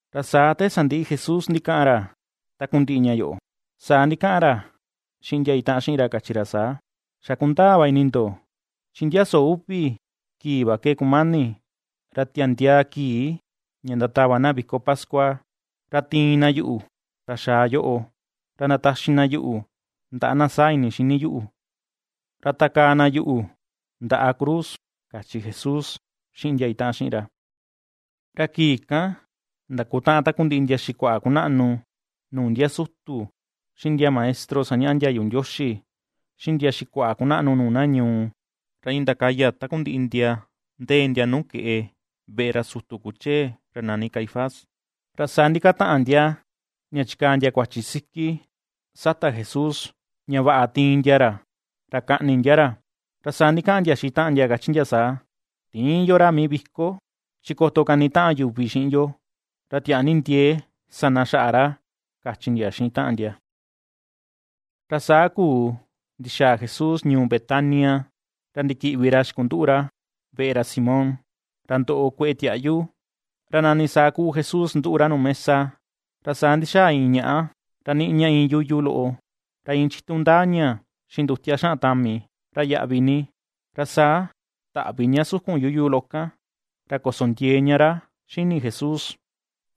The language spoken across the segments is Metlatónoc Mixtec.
Ra saa te sandiꞌi Jesús ndikaꞌan ra takundiꞌi ña yoꞌo, saa ndikaꞌan ra xiꞌin ndia itaꞌan xiꞌin ra kachi ra saa: ―Xa kundaa va ini ndo, chi ndia soo uvi kii va ke kumani ra tiandiaa kii ña ndatava na viko pascua, ra tiin na yuꞌu, ra xaa yoꞌo, ra ndataxi na yuꞌu ndaꞌa na saa ini xini yuꞌu, ra takaa na yuꞌu ndaꞌa cruz ―kachi Jesús xiꞌin ndia itaꞌan xiꞌin ra. Ra kii kan, ndakutaꞌan takundiꞌi ndia xikuaꞌa kunaꞌnu nuu ndia sutu xiꞌin ndia maestro sañaꞌa ndiayu Ndioxi, xiꞌin ndia xikuaꞌa kunaꞌnu nuu na ñuu, ra iin ndakaya takundiꞌi ndia ndee ndia nuu keꞌe veꞌe ra sutu kuchee ra nani Caifás. Ra saa ndikataꞌan ndia, ña chikaa ndia kuachi siki sata Jesús, ña vaꞌa tiin ndia ra, ra kaꞌni ndia ra. Ra saa ndikaꞌan ndia xiꞌin taꞌan ndia kachi ndia saa. ―Tïin yo ra mii viko, chi koto kanitaꞌan yuvi xiꞌin yo, ra tiaa ni ndiee sa na xaꞌa ra ―kachi ndia xiꞌin taꞌan ndia. Ra saa kuu ndixaa Jesús ñuu Betania, ra ndikiꞌvi ra xikunduꞌu ra veꞌe ra Simón, ra ndoꞌo kueꞌe tiaꞌyu. Ra nani saa kuu Jesús nduꞌu ra nuu mesa, ra saa ndixaa iin ñaꞌa, ra niꞌi ña iin yuyu loꞌo, ra iin chitu ndaa ña xiꞌin ndutia xaꞌan tami, ra yaꞌvi ni, ra saa taꞌvi ña sukun yuyu loꞌo kan, ra koso ndiee ña ra xini Jesús.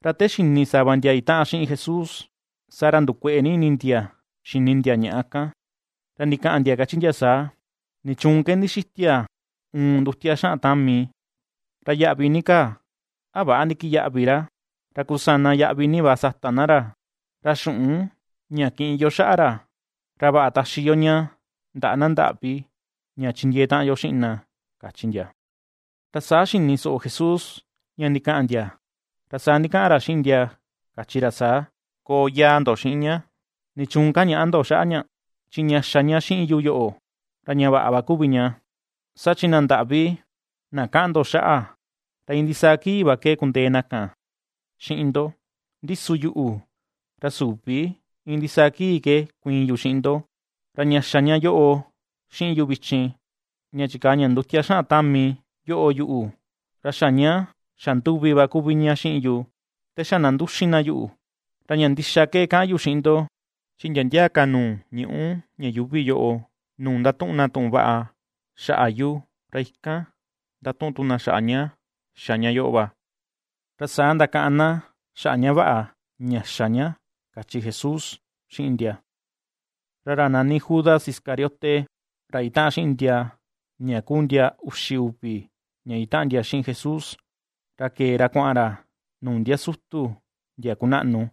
Ra te xini sava ndia itaꞌan xiꞌin Jesús, saa ra ndukueꞌe ni ini ndia xini ndia ñaꞌa kan, ra ndikaꞌan ndia kachi ndia saa: ―¿Nichuun ke ndixitia uun ndutia xaꞌan tami, ra yaꞌvi ni kaa? ¿A väꞌa ndikiyaꞌvi va ra? Ra kusana yaꞌvi ni va sata na ra, ra xuꞌun ña kiꞌin yo xaꞌa ra, ra vaꞌa taxi yo ña ndaꞌa na ndaꞌvi, ña chindiee taꞌan yo xiꞌin na ―kachi ndia. Ra saa xini soꞌo Jesús ña ndikaꞌan ndia, ra saa ndikaꞌan ra xiꞌin ndia kachi ra saa: ―Koo yaa ndo xiꞌin ña. ¿Nichuun kañaꞌa ndo xaꞌa ña? Chi ña xa ña xiꞌin yu yoꞌo, ra ña vaꞌa va kuvi ña. Saa chi na ndaꞌvi na kaꞌan ndo xaꞌa, ra iin ndisaa kii va ke kundee na kan xiꞌin ndo, ndi su yuꞌu, ra süvi iin ndisaa kii ke kuiin yu xiꞌin ndo. Ra ña xa ña yoꞌo xiꞌin yu vichin, ña chikaa ña ndutia ra xaꞌan tami yoꞌo yuꞌu, ra xa ña xanduvi va kuvi ña xiꞌin yu, te xa na nduxin na yuꞌu. Ra ña ndixa ke kaꞌan yu xiꞌin ndo, chi ndia ndia ka nuu ñuꞌu ña yuuvi yoꞌo, nuu ndatuꞌun na tuꞌun vaꞌa xaꞌa yu, ra ikan ndatuꞌun tu na xaꞌa ña xa ña yoꞌo va, ra saa ndakaꞌan na xaꞌa ña vaꞌa ña xa ña ―kachi Jesús xiꞌin ndia. Ra ra nani Judas Iscariote, ra itaꞌan xiꞌin ndia ña kuu ndia uxi uvi ña itaꞌan ndia xiꞌin Jesús, ra kee ra kuaꞌan ra nuu ndia sutu ndia kunaꞌnu.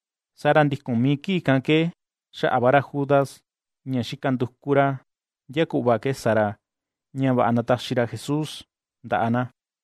Saa ra ndikun mii kii kan ke, xaꞌa va ra Judas, ña xika nduku ra ndia kuꞌva ke sa ra, ña vaꞌa ndataxi ra Jesús ndaꞌa na.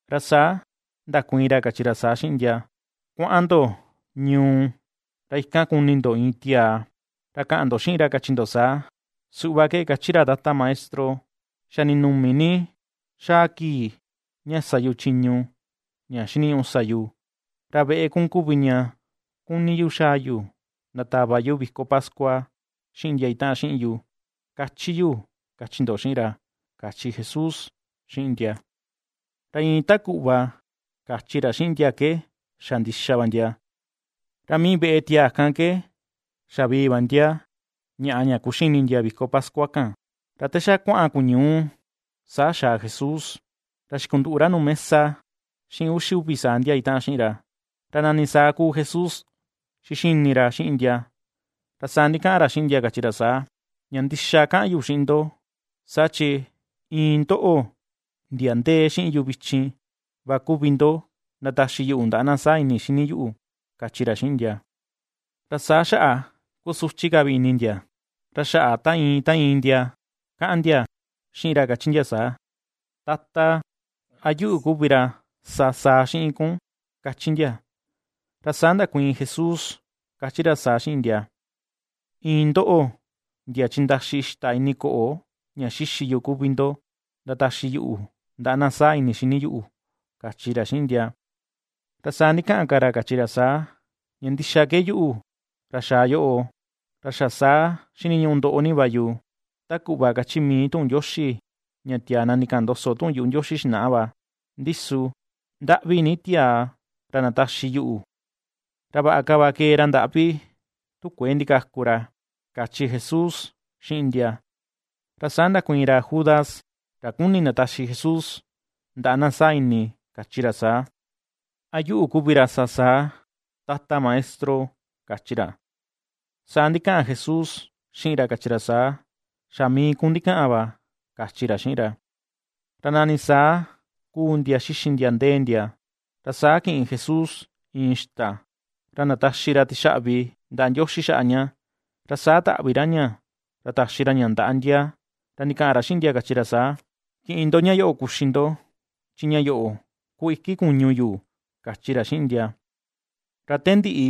Ra saa ndakuiin ra kachi ra saa xiꞌin ndia: ―Kuaꞌan ndo ñuu, ra ikan kuni ndo iin tiaa, ra kaꞌan ndo xiꞌin ra kachi ndo saa: “Suꞌva ke kachi ra Tata Maestro: Xa ninumi ni xaa kii ña sa yu chiñu ña xiniñuꞌu sa yu, ra veꞌe kun kuvi ña kuni yu xaa yu ndatava yu viko pascua xiꞌin ndia itaꞌan xiꞌin yu”, ^kachi yu, kachi ndo xiꞌin ra ―kachi Jesús xiꞌin ndia. Ra iin ta kuꞌva kachi ra xiꞌin ndia ke xa ndixa va ndia, ra mii veꞌe tiaa kan ke xavii va ndia ñaꞌa ña kuxini ndia viko pascua kan. Ra te xa kuaꞌan kuñuu, saa xaa Jesús, ra xikunduꞌu ra nuu mesa xiꞌin uxi uvi saa ndia itaꞌan xiꞌin ra. Ra nani saa kuu Jesús xixini ra xiꞌin ndia, ra saa ndikaꞌan ra xiꞌin ndia kachi ra saa: ―Ña ndixa kaꞌan yu xiꞌin ndo, saa chi iin ndoꞌo, ndia ndee xiꞌin yu vichin va kuvi ndo ndataxi yuꞌu ndaꞌa na saa ini xini yuꞌu ―kachi ra xiꞌin ndia. Ra saa xaꞌa kusuchi ka vi ini ndia, ra xaꞌa ta iin ta iin ndia kaꞌan ndia xiꞌin ra kachi ndia saa: ―Tata, ¿a yuꞌu kuvi ra sa saa xiꞌin kun? ―kachi ndia. Ra saa ndakuiin Jesús kachi ra saa xiꞌin ndia: ―Iin ndoꞌo ndia chindaxi ixta ini koꞌo ña xixi yu kuvi ndo ndataxi yuꞌu ndaꞌa na saa ini xini yuꞌu ―kachi ra xiꞌin ndia. Ra saa ndikaꞌan ka ra kachi ra saa: ―Ña ndixa ke yuꞌu ra xaa yoꞌo, ra xa saa xiniñuꞌu ndoꞌo ni va yu, ta kuꞌva kachi mii tuꞌun Ndioxi ña tiaa na ndikaꞌan ndoso tuꞌun yuꞌu Ndioxi xinaꞌa va. Ndi su, ¡ndaꞌvi ni tiaa ra ndataxi yuꞌu!, ra vaꞌa ka va kee ra ndaꞌvi tu kuëe ndikaku ra ―kachi Jesús xiꞌin ndia. Ra saa ndakuiin ra Judas, ra ^kuni ndataxi Jesús ndaꞌa na saa ini, kachi ra saa: ―¿A yuꞌu kuvi ra sa saa, Tata Maestro? ―kachi ra. Saa ndikaꞌan Jesús xiꞌin ra kachi ra saa: ―Xa mii kun ndikaꞌan va ―kachi ra xiꞌin ra. Ra nani saa kuu ndia xixi ndia ndee ndia, ra saa kiꞌin Jesús iin ixta, ra ndataxi ra tixaꞌvi ndaꞌa Ndioxi xaꞌa ña, ra saa taꞌvi ra ña, ra taxi ra ña ndaꞌa ndia, ra ndikaꞌan ra xiꞌin ndia kachi ra saa: ―Kiꞌin ndo ña yoꞌo kuxi ndo, chi ña yoꞌo ku iki kuñu yu ―kachi ra xiꞌin ndia. Ra te ndiꞌi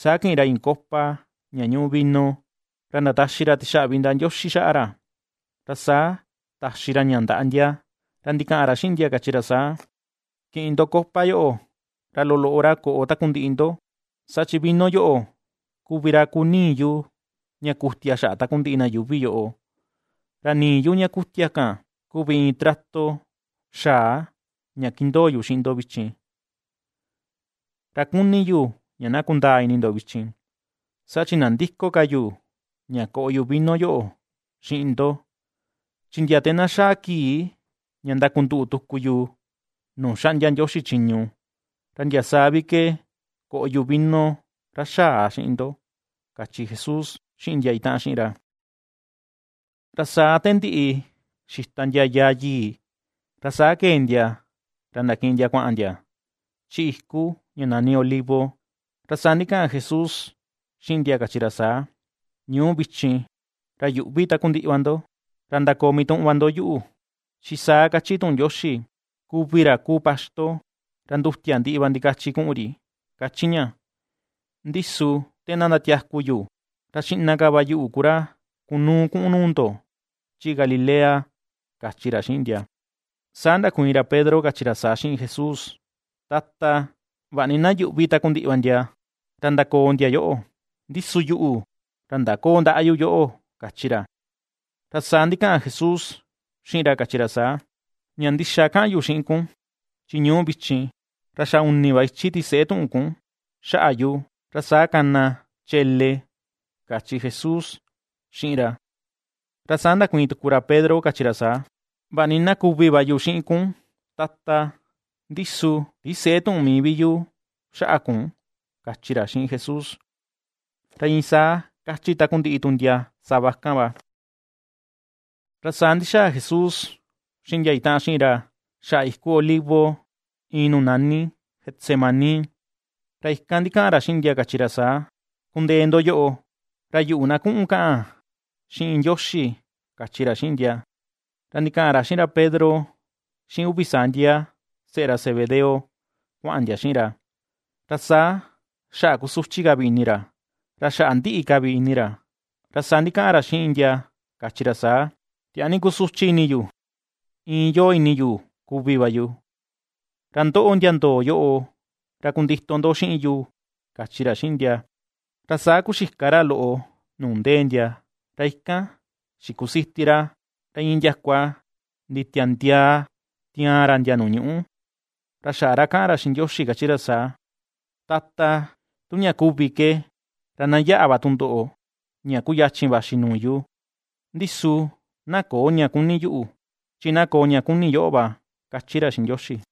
saa kiꞌin ra iin copa ña ñuꞌu vino, ra ndataxi ra tixaꞌvi ndaꞌa Ndioxi xaꞌa ra, ra saa taxi ra ña ndaꞌa ndia, ra ndikaꞌan ra xiꞌin ndia kachi ra saa: ―Kiꞌin ndo copa yoꞌo, ra loloꞌo ra koꞌo takundiꞌi ndo, saa chi vino yoꞌo kuvi ra kuu nii yu, ña kutia xaꞌa takundiꞌi na yuuvi yoꞌo, ra nii yu ña kutia kan, kuvi iin trato xaa ña kindoo yu xiꞌin ndo vichin. Ra kuni yu ña na kundaa ini ndo vichin, saa chi nandïko ka yu ña koꞌo yu vino yoꞌo xiꞌin ndo; chi ndia te na xaa kii ña ndakutaꞌan tuku yo nuu xaꞌndia Ndioxi chiñu, ra ndia saa vi ke koꞌo yu vino ra xaa xiꞌin ndo ―kachi Jesús xiꞌin ndia itaꞌan xiꞌin ra. Ra saa te ndiꞌi xita ndia yaa yii, ra saa kee ndia ra ndakiꞌin ndia kuaꞌan ndia, chi iku ña nani Olivo. Ra saa ndikaꞌan Jesús xiꞌin ndia kachi ra saa: ―Ñuu vichin ra yuꞌvi takundiꞌi va ndo, ra ndakoo mituꞌun va ndo yuꞌu, chi saa kachi tuꞌun Ndioxi: “Kuvi ra kuu paxto, ra ndutia ndiꞌi va ndikachi kuꞌun ri” ―kachi ña. Ndi su te na ndatiaku yu, ra xiꞌna ka va yuꞌu ku ra kunuu kuꞌun nuu ndo chi Galilea ―kachi ra xiꞌin ndia. Saa ndakuiin ra Pedro kachi ra saa xiꞌin Jesús: ―Tata, vaꞌa ni na yuꞌvi takundiꞌi va ndia, ra ndakoo ndia yoꞌo, ndi su yuꞌu, ra ndaköo ndaꞌa yu yoꞌo ―kachi ra. Ra saa ndikaꞌan Jesús xiꞌin ra kachi ra saa: ―Ña ndixa kaꞌan yu xiꞌin kun, chi ñuu vichin ra xa uni va ichi tiseꞌe tuꞌun kun xaꞌa yu, ra saa kana chele ―kachi Jesús xiꞌin ra. Ra saa ndakuiin tuku ra Pedro kachi ra saa: ―Vaꞌa ni na kuvi va yu xiꞌin kun, Tata, ndi su tisëꞌe tuꞌun mii vi yu xaꞌa kun ―kachi ra xiꞌin Jesús. Ra iin saa kachi takundiꞌi tu ndia sava kan va. Ra saa ndixaa Jesús xiꞌin ndia itaꞌan xiꞌin ra xaꞌa iku Olivo iin nuu nani Getsemaní, ra ikan ndikaꞌan ra xiꞌin ndia, kachi ra saa: ―Kundee ndo yoꞌo, ra yuꞌu na kuꞌun kaꞌan xiꞌin Ndioxi ―kachi ra xiꞌin ndia. Ra ndikaꞌan ra xiꞌin ra Pedro, xiꞌin uvi saa ndia seꞌe ra Zebedeo kuaꞌan ndia xiꞌin ra, ra saa xaꞌa kusuchi ka vi ini ra, ra xaꞌa ndiꞌi ka vi ini ra. Ra saa ndikaꞌan ra xiꞌin ndia kachi ra saa: ―Tiaa ni kusuchi ini yu, iin yoo ini yu kuvi va yu, ra ndoꞌo ndia ndoo yoꞌo, ra kundito ndo xiꞌin yu ―kachi ra xiꞌin ndia. Ra saa kuxika ra loꞌo nuu ndee ndia, ra ikan xikusiti ra, ra iin ndiakua nditiandiaa tiaan ra ndia nuu ñuꞌu, ra xaꞌa ra kaꞌan ra xiꞌin Ndioxi kachi ra saa: ―Tata, tu ña kuvi ke, ra na yaꞌa va tundoꞌo, ña kuyachin vaxi nuu yu; ndi su na köo ña kuni yuꞌu, chi na koo ña kuni yoꞌo va ―^kachi ra xiꞌin Ndioxi.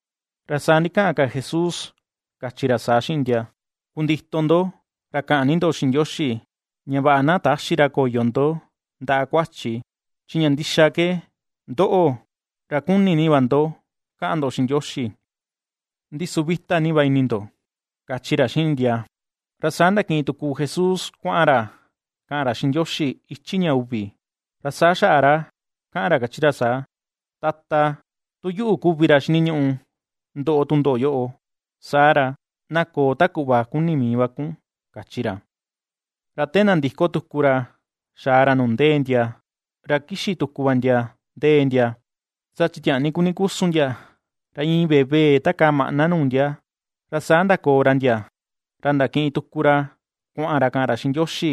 Ra saa ndikaꞌan ka Jesús, kachi ra saa xiꞌin ndia: ―Kundito ndo, ra kaꞌan ni ndo xiꞌin Ndioxi, ña vaꞌa na täxi ra koyo ndo ndaꞌa kuachi, chi ña ndixa ke: Ndoꞌo, ra kuni ni va ndo kaꞌan ndo xiꞌin Ndioxi, ndi su vita ni va ini ndo ―kachi ra xiꞌin ndia. Ra saa ndakiꞌin tuku Jesús kuaꞌan ra, kaꞌan ra xiꞌin Ndioxi ichi ña uvi, ra saa xaꞌa ra kaꞌan ra ^kachi ra saa: ―Tata, tu yuꞌu kuvi ra xiniñuꞌu ndoꞌo tundoꞌo yoꞌo, saa ra, na koo ta kuꞌva kuni mii va kun ―kachi ra. Ra te nandiko tuku ra xaa ra nuu ndee ndia, ra kixi tuku va ndia ndee ndia, saa chi tiaa ni kuni kusun ndia, ra iin vevee takaa maꞌna nuu ndia. Ra saa ndakoo ra ndia, ra ndakiꞌin tuku ra kuaꞌan ra kaꞌan ra xiꞌin Ndioxi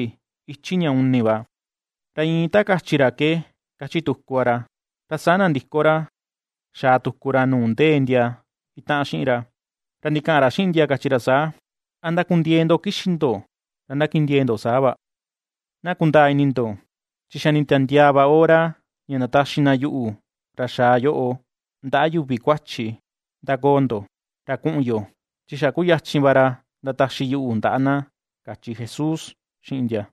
ichi ña uni va. Ra iin ta kachi ra ke, kachi tuku va ra. Ra saa nandiko ra, xaa tuku ra nuu ndee ndia itaꞌan xiꞌin ra, ra ndikaꞌan ra xiꞌin ndia kachi ra saa: ―¡A ndakundiee ndo kixi ndo ra ndakindiee ndo saa va! Na kundaa ini ndo, chi xa nditiandiaa va hora ña ndataxi na yuꞌu ra xaa yoꞌo, ndaꞌa yuvi kuachi. ^Ndakoo ndo, ra kuꞌun yo; chi xa kuyachin va ra ndataxi yuꞌu ndaꞌa na ―kachi Jesús xiꞌin ndia.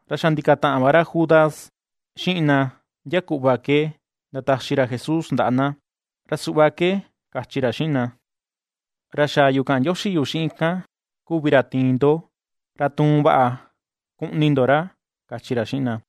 Ra xa ndikataꞌan va ra Judas xiꞌin na ndia kuꞌva ke ndataxi ra Jesús ndaꞌa na. Ra suꞌva ke kachi ra xiꞌin na: ―Ra xaa yu kaꞌan ndioxi yu xiꞌin kan kuvi ra tiin ndo, ra tuun vaꞌa kuꞌni ndo ra ―kachi ra xiꞌin na.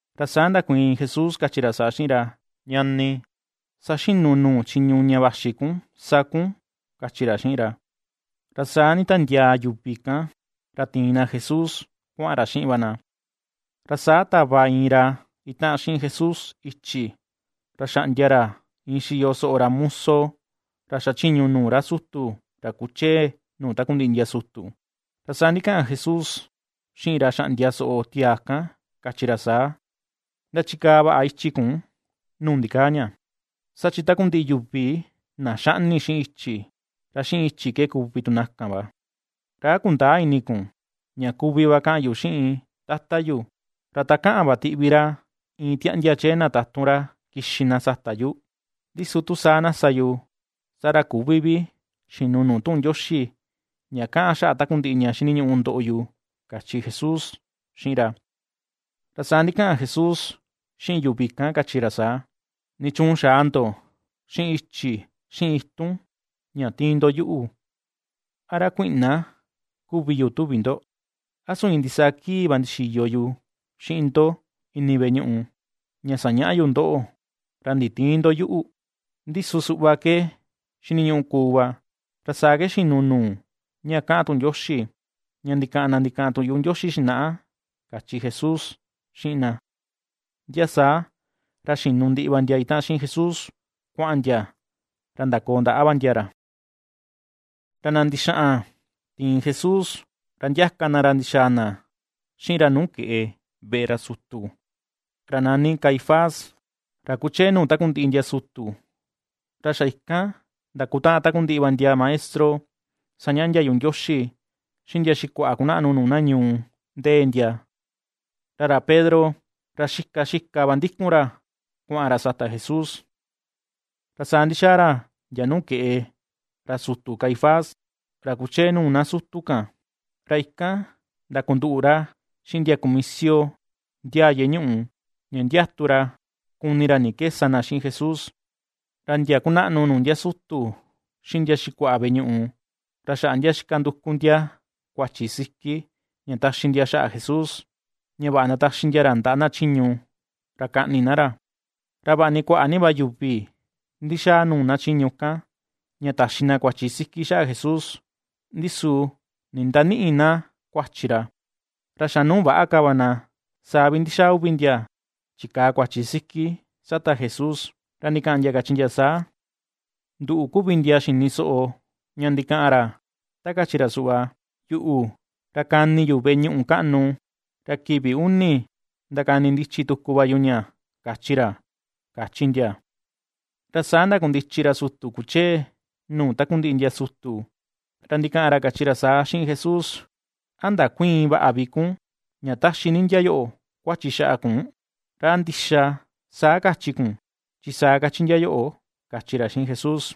Ra saa ndakuiin Jesús kachi ra saa xiꞌin ra: ―Ñani, saxinu nuu chiñu ña vaxi kun sa kun ―kachi ra xiꞌin ra. Ra saa nditiandiaa yuvi kan, ra ti̱in na Jesús kuaꞌan ra xiꞌin va na. Ra saa tava iin ra itaꞌan xiꞌin Jesús ichi, ra xaꞌndia ra iin xiyo soꞌo ra muso, ra xachiñu nuu ra sutu, ra kuchee nuu takundiꞌi ndia sutu. Ra saa ndikaꞌan Jesús xiꞌin ra xaꞌndia soꞌo tiaa kan, kachi ra saa: ―Ndachikaa vaꞌa ichi kun nuu ndikaa ña, saa chi takundiꞌi yuvi na xaꞌni xiꞌin ichi, ra xiꞌin ichi ke kuvi tu na kan va. ¿Ra a kundäa ini kun, ña kuvi va kaꞌan yu xiꞌin Tata yu, ra takaꞌan va tiꞌvi ra iin tiaꞌndia chee na tatun ra kixi na sata yu? Ndi su tu saa na sa yu, saa ra küvi vi xinu nuu tuꞌun Ndioxi ña kaꞌan xaꞌa takundiꞌi ña xiniñuꞌu ndoꞌo yu ―kachi Jesús xiꞌin ra. Ra saa ndikaꞌan Jesús xiꞌin yuvi kan, kachi ra saa: ―¿Nichuun xaa ndo xiꞌin ichi, xiꞌin itun ña tiin ndo yuꞌu, a ra kuiꞌna kuvi yu tuvi ndo? ¿A su iin ndisaa kii va ndixiyo yu xiꞌin ndo ini veꞌe ñuꞌu, ña sañaꞌa yu ndoꞌo, ra nditïin ndo yuꞌu? Ndi su, suꞌva ke xiniñuꞌu kuu va, ra saa ke xinu nuu ña kaꞌan tuꞌun Ndioxi, ña ndikaꞌan na ndikaꞌan tuꞌun yuꞌu Ndioxi xinaꞌa ―kachi Jesús xiꞌin na. Ndia saa, ra xinu ndiꞌi va ndia itaꞌan xiꞌin Jesús, kuaꞌan ndia, ra ndakoo ndaꞌa va ndia ra. Ra na ndixaꞌan tiin Jesús, ra ndiaka na ra ndixaa na xiꞌin ra nuu keꞌe veꞌe ra sutu, ra nani Caifás, ra kuchee nuu takundiꞌi ndia sutu. Ra xa ikan ndakutaꞌan takundiꞌi va ndia maestro sañaꞌa ndiayu Ndioxi, xiꞌin ndia xikuaꞌa kunaꞌnu nuu na ñuu, ndee ndia. Ra ra Pedro, ra xika xika va ndikun ra kuaꞌan ra sata Jesús, ra saa ndixaa ra ndia nuu keꞌe ra sutu Caifás ra kuchee nuu na sutu kan, ra ikan ndakunduꞌu ra xiꞌin ndia kumisio ndiaa yeꞌe ñuꞌu, ña ndiatu ra, kuni ra ni ke sa na xiꞌin Jesús. Ra ndia kunaꞌnu nuu ndia sutu, xiꞌin ndia xikuaꞌa veꞌe ñuꞌu, ra xaꞌa ndia xika nduku ndia kuachi siki, ña taxi ndia xaꞌa Jesús, ña vaꞌa ndataxi ndia ra ndaꞌa na chiñu, ra kaꞌni na ra. Ra vaꞌa ni kuaꞌa ni va yuvi ndixaa nuu na chiñu kan, ña taxi na kuachi siki xaꞌa Jesús, ndi su nindanïꞌi na kuachi ra. Ra xa nuu väꞌa ka va na, saa vi ndixaa uvi ndia chikaa kuachi siki sata Jesús, ra ndikaꞌan ndia, kachi ndia saa: ―Nduꞌu kuu ndia xini soꞌo ña ndikaꞌan ra, ta kachi ra suꞌva “Yuꞌu, ra kani yu veꞌe ñuꞌu kaꞌnu, ra kivi uni ndakanindichi tuku va yu ña” kachi ra ―kachi ndia. Ra saa ndakundichi ra sutu ra kuchee nuu takundiꞌi ndia sutu, ra ndikaꞌan ra kachi ra saa xiꞌin Jesús: ―¿A ndakuïin vaꞌa vi kun ña taxi ni ndia yoꞌo kuachi xaꞌa kun? ¿Ra a ndixa saa kachi kun, chi saa kachi ndia yoꞌo? ―kachi ra xiꞌin Jesús.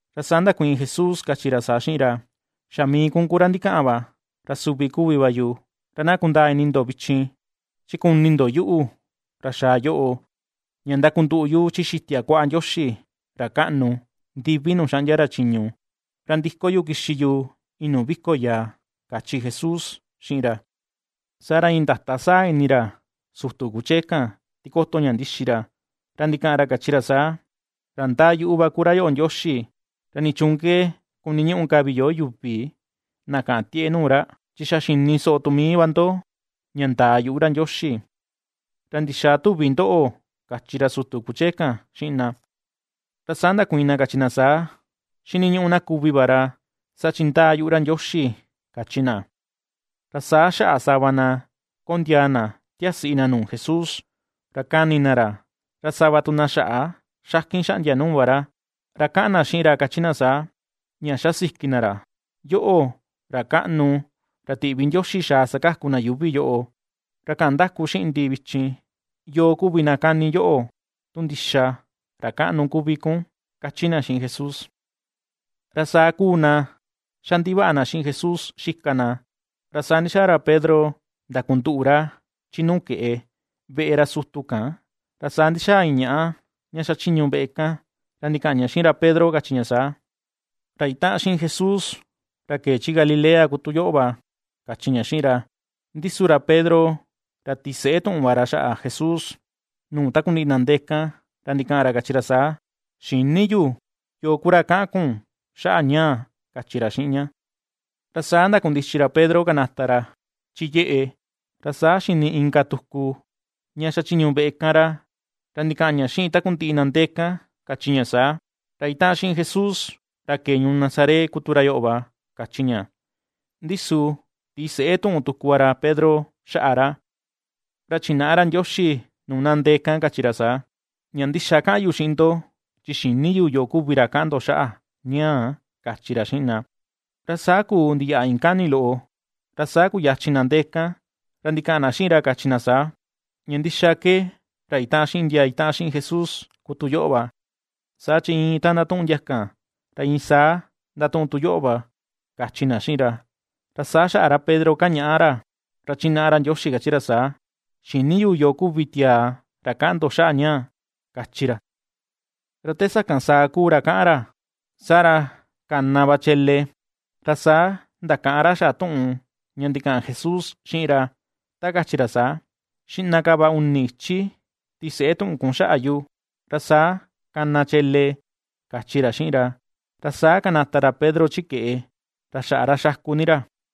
Ra saa ndakuiin Jesús kachi ra saa xiꞌin ra: ―Xa mii kun ku ra ndikaꞌan va, ra suvi kuvi va yu. Ra na kundaa ini ndo vichin, chi kuni ndo yuꞌu ra xaa yoꞌo, ña ndakunduꞌu yu chi xitia kuaꞌa Ndioxi ra kaꞌnu, ndivi nuu xaꞌndia ra chiñu, ra ndiko yu kixi yu iin nuu viko yaa ―kachi Jesús xiꞌin ra. Saa ra iin ndata saa ini ra sutu kuchee kan tikoto ña ndixi ra, ra ndikaꞌan ra kachi ra saa: ―Ra ndaa yuꞌu va ku ra yoꞌo Ndioxi. ¿Ra nichuun ke kuniñuꞌu ka vi yo yuvi na kaꞌan tieꞌe nuu ra?, chi xa xini soꞌo tu mii va ndo, ña ndaa yuꞌu ra Ndioxi. ¿Ra ndixaa tuvi ndoꞌo? ―kachi ra sutu kuchee kan xiꞌin na. Ra saa ndakuiin na kachi na saa: ―Xiniñuꞌu na kuvi va ra, saa chi ndaa yuꞌu ra Ndioxi ―kachi na. Ra saa xaꞌa sava na kondiaa na tiasiꞌi na nuu Jesús, ra kani ni na ra, ra sava tu na xaꞌa xakin xaꞌndia nuu va ra. Ra kaꞌan na xiꞌin ra kachi na saa, ña xasiki na ra: ―Yoꞌo, ra kaꞌnu, ra tiꞌvi Ndioxi xaa sakaku na yuuvi yoꞌo, ra kaꞌan ndaku xiꞌin ndi vichin, ¿yoo kuvi na kani yoꞌo?, tu ndixa ra kaꞌnu kuvi kun ―kachi na xiꞌin Jesús. Ra saa ^kuu na xa ndivaꞌa na xiꞌin Jesús xika na. Ra saa ndixaa ra Pedro ndakunduꞌu ra chi nuu keꞌe, veꞌe ra sutu kan, ra saa ndixaa iin ñaꞌa, ña xachiñu veꞌe kan, ra ndikaꞌan ña xiꞌin ra Pedro kachi ña saa: ―Ra itaꞌan xiꞌin Jesús, ra kee chi Galilea kuu tu yoꞌo va ―kachi ña xiꞌin ra. Ndi su ra Pedro, ra tiseꞌe tuꞌun va ra xaꞌa Jesús, nuu takundiꞌi na ndee kan, ra ndikaꞌan ra kachi ra saa: ―Xïni yu yoo ku ra kaꞌan kun xaꞌa ñaa ―kachi ra xiꞌin ña. Ra saa ndakundichi ra Pedro kanata ra chi yeꞌe, ra saa xini inka tuku ña xachiñu veꞌe kan ra, ra ndikaꞌan ña xiꞌin takundiꞌi na ndee kan, kachi ña saa: ―Ra itaꞌan xiꞌin Jesús, ra kee ñuu Nazaret ku tu ra yoꞌo va ―kachi ña. Ndi su tiseꞌe tuꞌun tuku va ra Pedro xaꞌa ra, ra chinaꞌa ra Ndioxi nuu na ndee kan, kachi ra saa: ―Ña ndixa kaꞌan yu xiꞌin ndo, chi xïni yu yoo kuvi ra kaꞌan ndo xaꞌa ñaa ―kachi ra xiꞌin na. Ra saa kuu ndiyaꞌa iin kani loꞌo, ra saa kuyachin na ndee kan, ra ndikaꞌan na xiꞌin ra kachi na saa: ―Ña ndixa ke ra itaꞌan xiꞌin ndia itaꞌan xiꞌin Jesús ku tu yoꞌo va, saa chi iin ta ndatuꞌun ndia kan, ra iin saa ndatuꞌun tu yoꞌo va ―kachi na xiꞌin ra. Ra saa xaꞌa ra Pedro, kañaꞌa ra, ra chinaꞌa ra Ndioxi, kachi ra saa: ―Xïni yu yoo kuvi tiaa ra kaꞌan ndo xaꞌa ñaa ―kachi ra. Ra te sakan saa kuu ra kaꞌan ra, saa ra kana va chele. Ra saa ndakaꞌan ra xaꞌa tuꞌun ña ndikaꞌan Jesús xiꞌin ra, ta kachi ra saa: “Xiꞌna ka va uni ichi tiseꞌe tuꞌun kun xaꞌa yu, ra saa kana chele”, kachi ra xiꞌin ra. Ra saa kanata ra Pedro chi keꞌe, ra xaꞌa ra xaku ni ra.